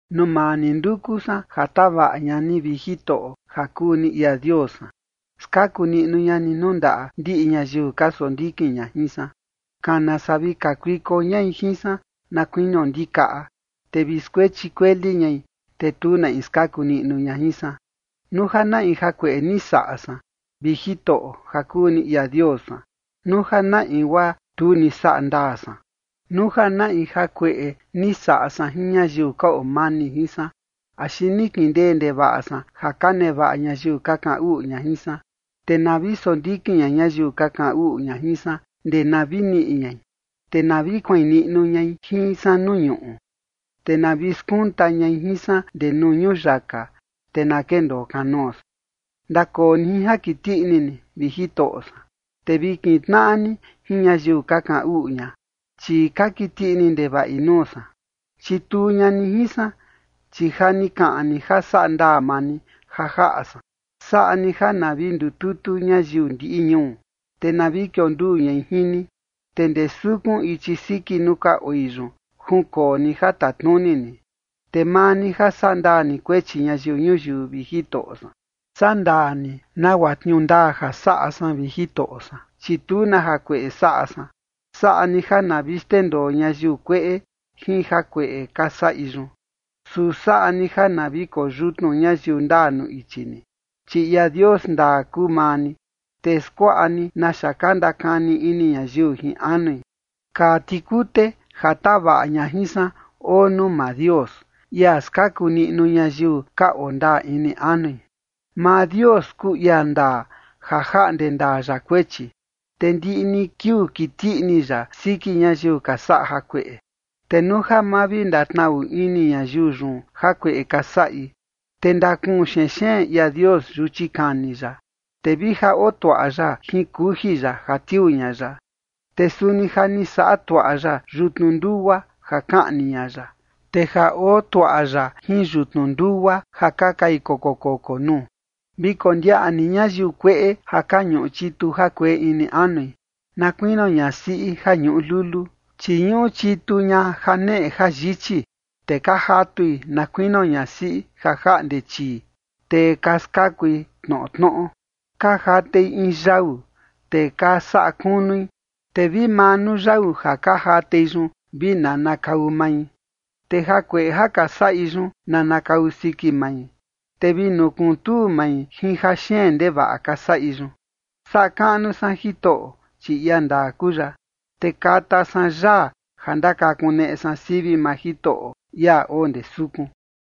Nuu maa ni nduku san ja tavaꞌa ña ni, vi Jitoꞌo ja kuu ni ia Dios san. Skaku niꞌnu ña ni nuu ndaꞌa ndiꞌi ñayiu ka sondikin ña jin san. Kana saa vi kakuiko ñai jin san na kuinio ndikaꞌa, te vi skuechi kueli ñai, te tu na in skaku niꞌnu ña jin san. Nuu ja na in jakueꞌe ni saꞌa san, vi Jitoꞌo ja kuu ni ia Dios san, nuu ja na in guaa tu ni saꞌa ndaa san, nuu ja na in jakueꞌe ni saꞌa san jin ñayiu ka oo mani jin san, axi ni kindee ndevaꞌa san ja ka nevaꞌa ñayiu ka kaꞌan uꞌu ña jin san, te na vi sondikin ña ñayiu ka kaꞌan uꞌu ña jin san ndee na vi niꞌi ñai, te na vi kuain niꞌnu ñai jin san nuu ñuꞌu, te na vi skunta ñai jin san ndee nuu ñuyaka, te na kendoo kanoo san. Ndakoo ni jin ja kiti ini ni, vi Jitoꞌo san, te vi kintnaꞌa ni jin ñayiu ka kaꞌan uꞌu ña, chi ka kiti ini ndevaꞌi nuu san. Chituu ña ni jin san, chi ja ni kaꞌan ni ja saꞌa ndaa maa ni ja jaꞌa san. Saꞌa ni ja na vi ndututu ñayiu ndiꞌi ñuu, te na vi kionduu ñai jin ni, te ndee sukun ichi siki nuu ka oi yun, junkoo ni ja tatnuni ni. Te maa ni ja sandaa ni kuechi ñayiu ñuyiu, vi Jitoꞌo san, sandaa ni nagua tniuu ndaa ja saꞌa san, vi Jitoꞌo san, chi tu na jakueꞌe saꞌa san. Saꞌa ni ja na vi xndendoo ñayiu kueꞌe jin jakueꞌe ka saꞌi yun. Su saꞌa ni ja na vi koyutnu ñayiu ndaa nuu ichi ni, chi ia Dios ndaa kuu maa ni, te skuaꞌa ni naxa ka ndakani ini ñayiu jin anui. Kaa tikute ja tavaꞌa ña jin san oo nuu maa Dios, ia skaku niꞌnu ñayiu ka oo ndaa ini anui. Maa Dios kuu ia ndaa ja jaꞌnde ndaa ya kuechi, te ndiꞌi ni kiuu kiti ini ya siki ñayiu ka saꞌa jakueꞌe. Te nuu ja ma vi ndatnaꞌu ini ñayiu yun jakueꞌe ka saꞌi, te ndakuun xenxeen ia Dios yuchi kani ya, te vi ja oo tuaꞌa ya jin kuji ya ja tiuu ña ya. Te suni ja ni saꞌa tuaꞌa ya yutnu ndugua ja kaꞌni ña ya, te ja oo tuaꞌa ya jin yutnu ndugua ja ka kai koko koko nuu. Vi kondiaꞌa ni ñayiu kueꞌe ja ka ñuꞌu chitu jakueꞌe ini anui, na kuinio ñasiꞌi ja ñuꞌu lulu, chi ñuꞌu chitu ña janeꞌe jayichi, te ka jatui na kuinio ñasiꞌi ja jaꞌnde chii, te ka skakui tnoꞌo tnoꞌo. Ka jatei in yau, te ka saꞌa kunui, te vi maa nuu yau ja ka jatei yun vi nanakau mai. Te jakueꞌe ja ka saꞌi yun nanakau siki mai, te vi nukuntuu mai jin jaxeen ndevaꞌa ka saꞌi yun. Saꞌa kaꞌnu san Jitoꞌo, chi ia ndaa kuu ya, te kata san yaa ja ndakakuneꞌe san sivi maa Jitoꞌo, ia oo ndee sukun.